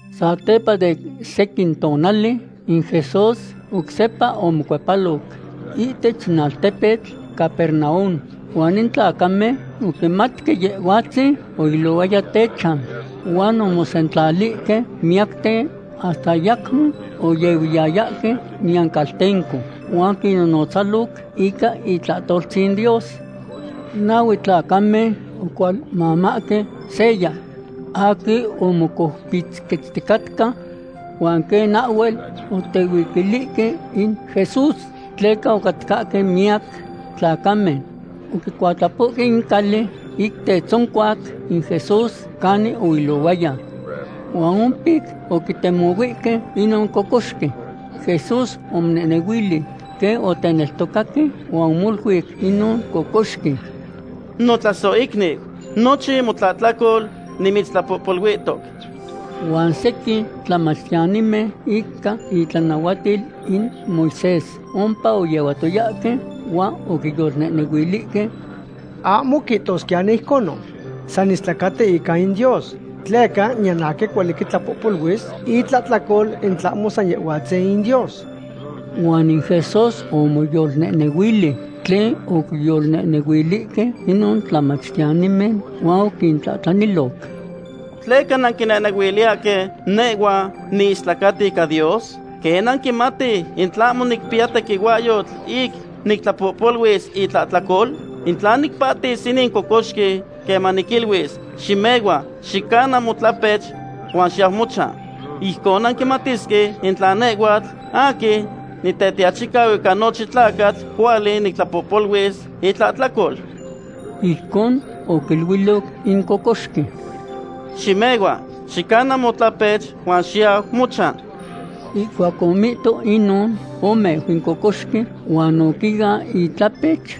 Satepa de sequin tonali in Jesús oc sepa omocuepaloc ihtech in altepetl Capernaum, huan in tlacamen oquimatque Yehhuatzin oilohuaya techan. Huan omosentlalihque miyacten, hasta ayacmo oyehuiyayahque niyan caltenco, huan oquinnonotzaloc ica itlahtoltzin Dios. Nahue tlacamen ocualmamahque seya aquin omocoupitzquetzticatca. Huan quen ahhuel otehuiquilihque in Jesús tleca ocatcahque miyac tlacamen, oquicuatlapohque in cali ic tetzoncuac in Jesús canin oilohuaya. Huan ompic oquitemohuihque inon cocoxqui. Jesús omonehnehuilic quen oteneltocaque huan omoluic inon cocoxqui: ―Notlasohicniu, nochin motlahtlacol nimitztlapohpoluihtoc. Huan sequin tlamachtiyanimen ica itlanahuatil in Moisés ompa oyehuatoyahque, huan oquiyolnehnehuilihque: “Ahmo quihtosquiyani ijconon. San istlacati ica in Dios. Tleca niyan aquin cuali quitlahtlapoluis itlahtlacol in tlahmo san Yehhuatzin in Dios.” Huan in Jesús omoyolnehnehuili tlen oquiyolnehnehuilihque inon tlamachtiyanimen, huan oquintlahtlaniloc: ―¿Tleca nanquiyolnehnehuiliyahque nehhua niistlacatqui ica in Dios? ¿Quen nanquimatihque in tlahmo nicpiya tequihuahyotl ic nictlapohpoluis itlahtlacol? In tla nicpahtis inin cocoxqui queman niquiluis: “Ximehua, xicana motlapech, huan xiyau mochan”, ijcon nanquimatisque in tla nehhuatl aquin Nitetiachicau ica nochin tlacatl cuali nictlapohpoluis itlahtlacol. Ijcon oquiluiloc in cocoxqui: ―Ximehua, xicana motlapech, huan xiyau mochan. Ihcuac omihto inon, omeu in cocoxqui, huan oquian itlapech,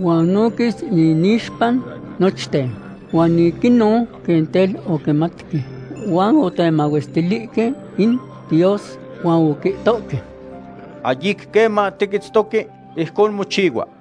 huan oquis inixpa nochten. Huan ic inon quen tel oquimatque huan otemahuestilihque in Dios, huan oquihtohque: ―Ahyic queman tiquitztoque ijcon mochihua.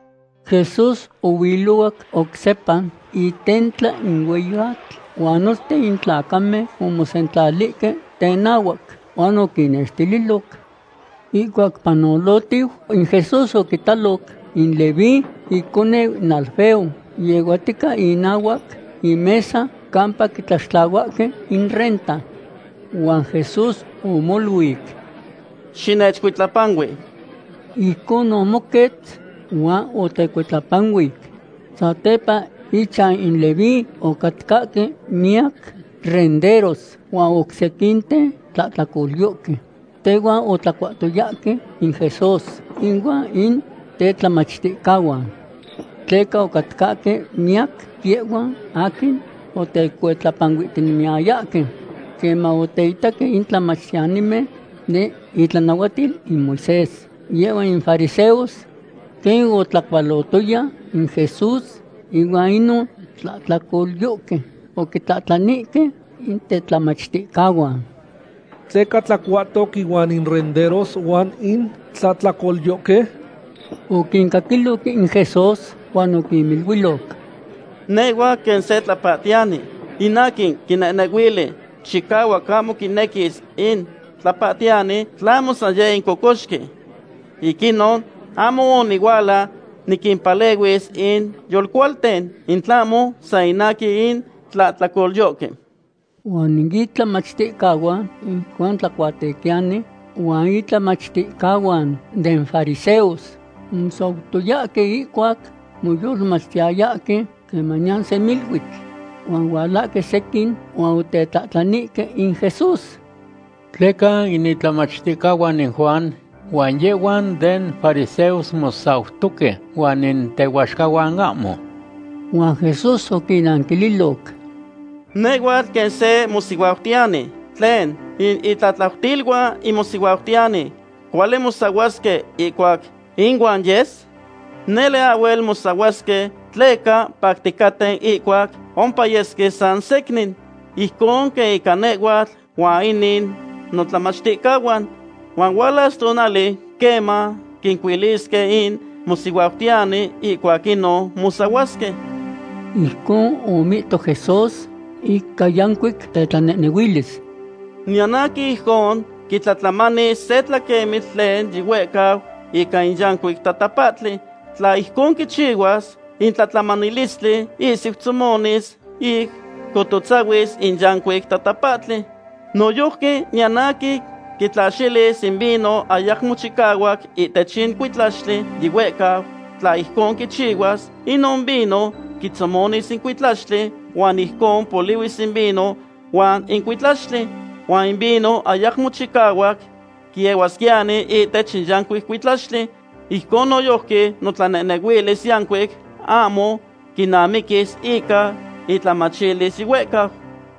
Jesús ohuilohuac oc sepa itentla in hueyi atl, huan nochten in tlacamen omosentlalihque tenahuac huan oquinnextililoc. Ihcuac panolohtiu, in Jesús oquitaloc in Leví, iconeu in Alfeo, yehuatica inahuac imesa campa quitlaxtlahuahque in renta. Huan Jesús omoluic: ―¡Xinechcuitlapanui! Ijcon omoquetz huan otecuitlapanuic. Satepa ichan in Leví ocatcahque miyac renderos huan oc sequinten tlahtlacolyohque. Tehuan otlacuahtoyahque in Jesús ihuan in tetlamachticahuan. Tleca ocatcahque miyac yehhuan aquin otecuitlapanuihtinemiyayahque. Queman oteitaque in tlamachtiyanimen den itlanahuatil in Moisés, yehhuan in fariseos, quen otlacualotoya in Jesús ihuan inon tlahtlacolyohque, oquintlahtlanihque in tetlamachticahuan: ―¿Tleca tlacuatoc ihuan in renderos huan in tlahtlacolyohque? Oquincaquiloc in Jesús, huan oquiniluiloc: ―Nehhua quen se tlapahtiyani. In aquin quinehnehuili chicahuac ahmo quinequis in tlapahtiyani, tlahmo san yeh in cocoxqui. Ic inon ahmo onihuala niquimpalehuis in yolcualten, in tlahmo san ica in tlahtlacolyohque. Huan in itlamachticahuan in Juan Tlacuatequiyani huan intlamachticahuan den fariseos omosautoyahque ihcuac moyolmachtiyayahque quemaniyan semiluitl. Huan ohualahque sequin huan otetlahtlanihque in Jesús: ―¿Tleca in itlamachticahuan in Juan huan yehhuan den fariseos mosautohque, huan in tehuaxcahuan ahmo? Huan Jesús oquinnanquililoc: ―Nehhuatl quen se mosihuautiyani. ¿Tlen, in itlatlautiluan in mosihuautiyani cuali mosahuasque ihcuac inuan yes? Nele ahhuel mosahuasque tleca pacticaten ihcuac ompayesque san secnin. Ijcon quen ica nehhuatl huan inin notlamachticahuan. Huan hualas tonali queman quincuilisque in mosihuautiyani. Ihcuac inon mosahuasque. Ijcon omihto Jesús ica yancuic tetlanehnehuilis: ―Niyan aquin ijcon quitlatlamanis se tlaquemitl tlen yihuehcau ica in yancuic tatapahtli. Tla ijcon quichihuas, in tlatlamanilistli ihsiu tzomonis ic cocotzahuis in yancuic tatapahtli. Noyojqui niyan aquin quitlaxilis in vino ayamo chicahuac ihtech in cuitlaxtli yihuehcau. Tla ijcon quichihuas, inon vino quitzomonis in cuitlaxtli, huan ijcon polihuis in vino huan in cuitlaxtli. Huan in vino ayamo chicahuac quiehuasquiyani ihtech in yancuic cuitlaxtli. Ijcon noyojqui notlanehnehuilis yancuic ahmo quinamiquis ica intlamachilis yihuehcau.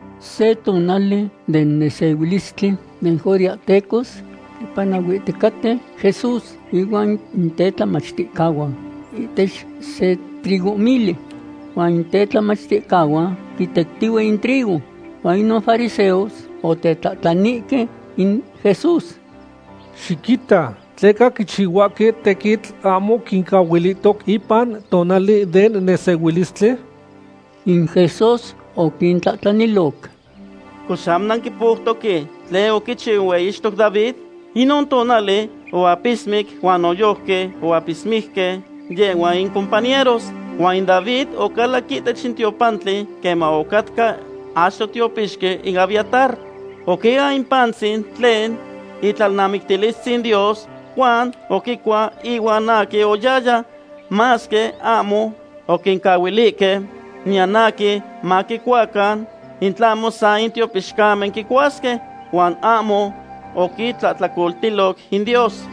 Se tonali den nesehuilistli den judeahtecos quipanahuiticaten Jesús ihuan in tetlamachticahuan ihtech se trigohmili. Huan in tetlamachticahuan quitectihue in trigo. Huan inon fariseos otetlahtlanihque in Jesús: ―Xiquita, ¿tleca quichihuahque tequitl ahmo quincahuilihtoc ipan tonali den nesehuilistli? In Jesús oquintlahtlaniloc: ―Cox, ¿ahmo nanquipoutoque tlen oquichiu in hueyixtoc David? Inon tonali oapismic huan noyojqui oapismique yehhuan icompañeros. Huan in David ocalac ihtech in tiopantli queman ocatca achto tiopixqui in Abiatar. Oquian in pantzin tlen itlalnamictiltzin Dios, huan oquicua ihuan aquin oyahyaya, masque ahmo oquincahuilihque niyan aquin maquicuacan, in tlahmo san in tiopixcamen quicuasque. Huan ahmo oquitlahtlacoltiloc in Dios.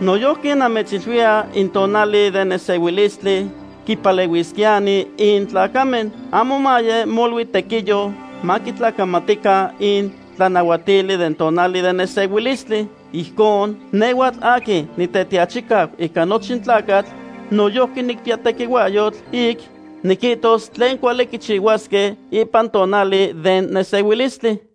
Noyojqui namechiluiya in tonali den nesehuilistli quipalehuisquiyani in tlacamen. Ahmo maye molui tequiyo maquitlacamatican in tlanahuatili den tonali den nesehuilistli. Ijcon, nehhuatl aquin Nitetiachicau ica nochin tlacatl noyojqui nicpiya tequihuahyotl ic niquihtos tlen cuali quichihuasque ipan tonali den nesehuilistli.